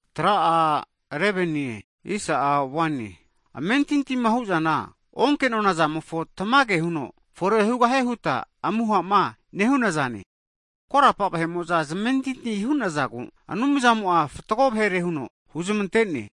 Hagi amentintima hu'zana, onke'nona zamofo tamage huno fore hugahie huta amuhama nehuna zane. Korapa vahe'mo'za zamentinti hu'nazagu, Anumzamo'a fatgo vahere huno huzmantene.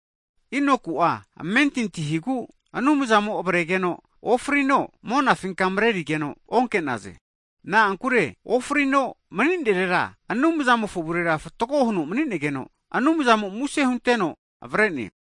Enoku'a amentinti higu Anumzamo'a avregeno ofrineno, monafinka marerige'za onke'naze. Na'ankure ofrino mani'nerera Anumzamofo avurera fatgo huno mani'negeno, Anumzamo muse hunteno avare'ne.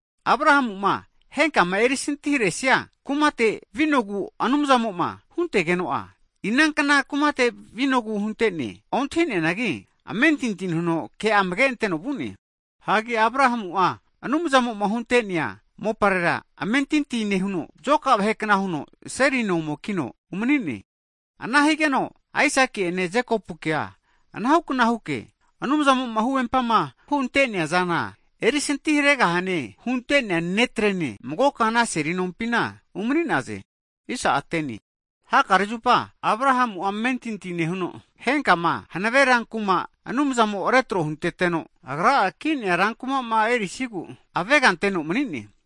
Abrahamu'ma henkama erisinti haresia kumate vinogu Anumzamo'ma huntegeno'a, inankna kumate vinogu huntene ontahi'neanagi, amentinti nehuno ke amageanteno vu'ne. Hagi Abrahamu'a Anumzamo'ma hunte'nea moparera amentinti nehuno zoka vahekna huno, seli no ome kino umanine. Ana higeno Asaki'ene Jekopukea anahukna huke Anumzamo'a huvempama hunte'nea zana erisintiharegaha'e hunte'nea netrene magoka ana seli nompina umani'naze. Hakare zupa Abrahamu'a amentinti nehuno, henkama hanave ranku'ma Anumzamo retro hunteteno, Agra'a ki'nea ranku'ma erisigu aveganteno manine.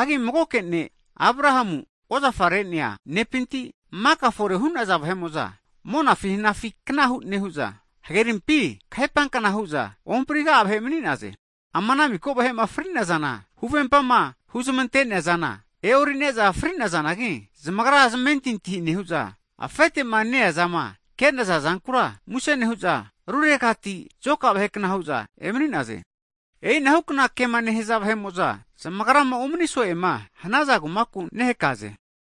Hagi magoke ne' Abrahamu'a ozafarenea nepinti, maka fore hu'naza vahe'mo'za, monafi hanafi kna nehu'za, hagerinkenafi kahepankna hu'za ohampriga'a vahe mani'naze. Ama ana miko vahe'ma fri'nazana, huvempama huzmante'neazana e'orine'za fri'nazanagi, zamagra zmentinti nehu'za, afete'ma ne-eazama kenaza zankura muse nehu'za, ruregati zoka vahekna hu'za emani'naze. E'ina hukna kema nehaza vahe'mo'za, zamagrama umani so'ema hanaza kumaku nehakaze.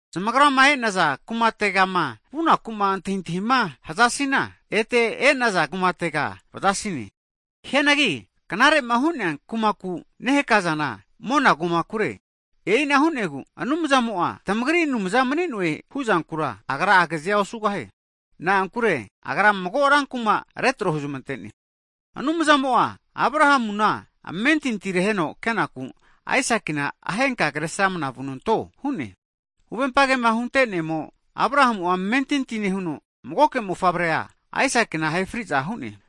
Zamagrama e'naza kumategama vunakuma antahintahima hazasina, ete e'naza kumatega vazasine. Hianagi knarema hu'nea kumaku nehakazana mona kumare. E'ina hu'negu Anumzamo'a tamagri Anumza mani'noe huzankura, Agra agazea osugahie. Na'ankure Agra mago ranku'ma retro huzmantene. Anumzamo'a Abrahamuna amentinti reheno kenaku, Aisakina ahenka kre sramana vunanto hu'ne. Huvempa kema huntenemo Abrahamu'a amentinti nehuno, magoke mofavrea Aisakina ahe fri'za hu'ne.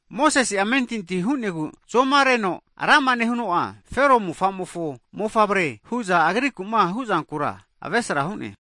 Mosese'a amentinti hu'negu, zomareno rama nehuno'a Fero mofamofo mofavre hu'za agrikuma huzankura avesra hu'ne.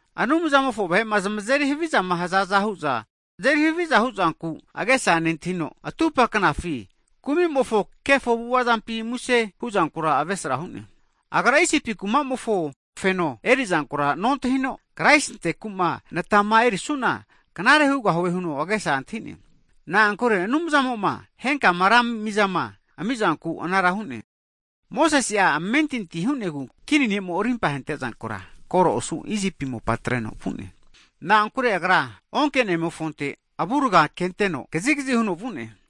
Anumzamofo vahe'ma zamazeri havizama hazaza hu'za azeri haviza huzanku agesa nentahino, atupa knafi kumimofo kefo avu'avazampi muse huzankura avesra hu'ne. Agra Isipi kumamofo feno erizankura nontahino, Kraisintekuma natama erisuana knare hugahie huno agesa antahine. Na'ankure Anumzamo'ma henkama ra mizama amizanku anara hu'ne. Mosese'a amentinti hu'negu kini ne'mo'ma arimpa ahentezankura koro osu Isipi mopa atreno vu'ne. Na'ankure agra onkenemofonte avuraga kenteno kazigazi huno vu'ne.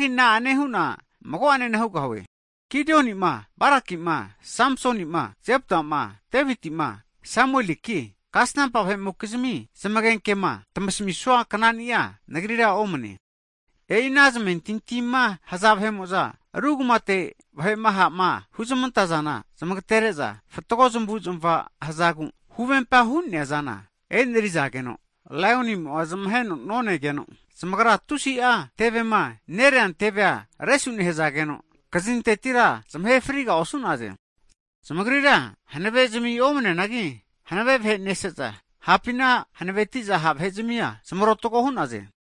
Hagi na'ane hu'na mago'anena hugahue? Gidionima, Barakima, Samsonima, Jeptama, Devitima, Samueliki, kasanampa vahe'mokizmi zamagenkema tamasamisua knani'a nagrira omne'nene. E'i ana zamentintima haza vahe'mo'za ru kumate vahe'ma ha'ma huzmantazana zmagatenere'za, fatgo zamavuzmava hazagu huvempama hu'nea zana enerizageno, laionimofo zmagira ruhamunki'naze. Zamagra tusi'a tevema nereantevea resu nehazageno, kazintetira zamahe friga osu'naze. Zamagrira hanavezmi omaneneanagi hanave vahe nese'za, hapina hanavetiza ha' vahe zamia zamarotago hu'naze.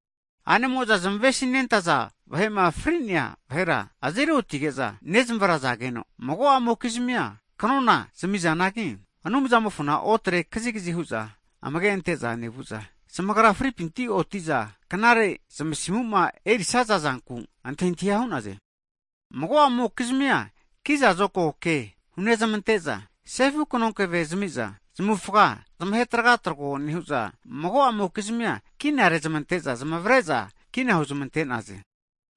A'nemo'za zamavesi nentaza vahe'ma fri'nea vahera azeri otige'za nezmavrazageno, mago'amokizmia kanona zamizanagi, Anumzamofona otre kazigazi hu'za amage'anteza nevu'za, zamagra fripinti oti'za knare zmasimuma erisaza zanku antahintahi hu'naze. Mago'amokizmia kiza zokago ke hu'nezamante'za sefu kanonkeve zamiza zamavufaga zamahe tragatrogo nehu'za, mago'amokizmi'a seni nofiteti kina rezmante'za zamavare'za kina hu'nezmantaze.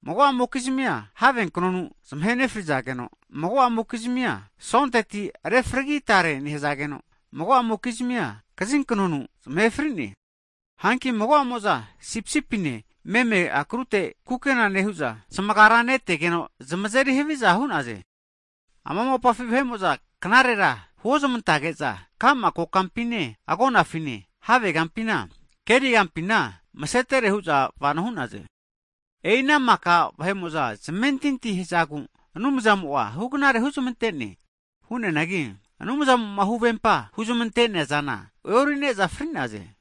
Mago'amokizmia have knonu zamahe nefrizageno, mago'a mokizmia sonteti refragi tare nehazageno, mago'amokizmi kaziknonu zamahe fri'naze. Hanki mago'amo'za sipisipine meme akrute kukena nehu'za, zamagara netegeno, zamazeri haviza hu'naze. Ama mopafi vahe'mo'za knarera huozamantege'za, ka'ma kokampine, agonafine, havegampima, kerigampina masetere hu'za vano hu'naze. E'i ana maka vahe'mo'za zmentinti hazagu, Anumzamo'a hugnare huzmantene. Hu'neanagi Anumzamo'ma huvempa huzamante'nea zana e'orine'za fri'naze.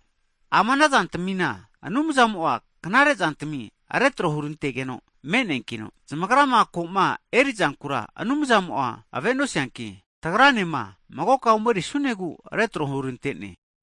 Ama anazantamina Anumzamo'a knarezantami retro hurantegeno me'neankino, zamagrama koma erizankura Anumzamo'a avenosianki, tagranema magoka omerisunegu retro hurantene.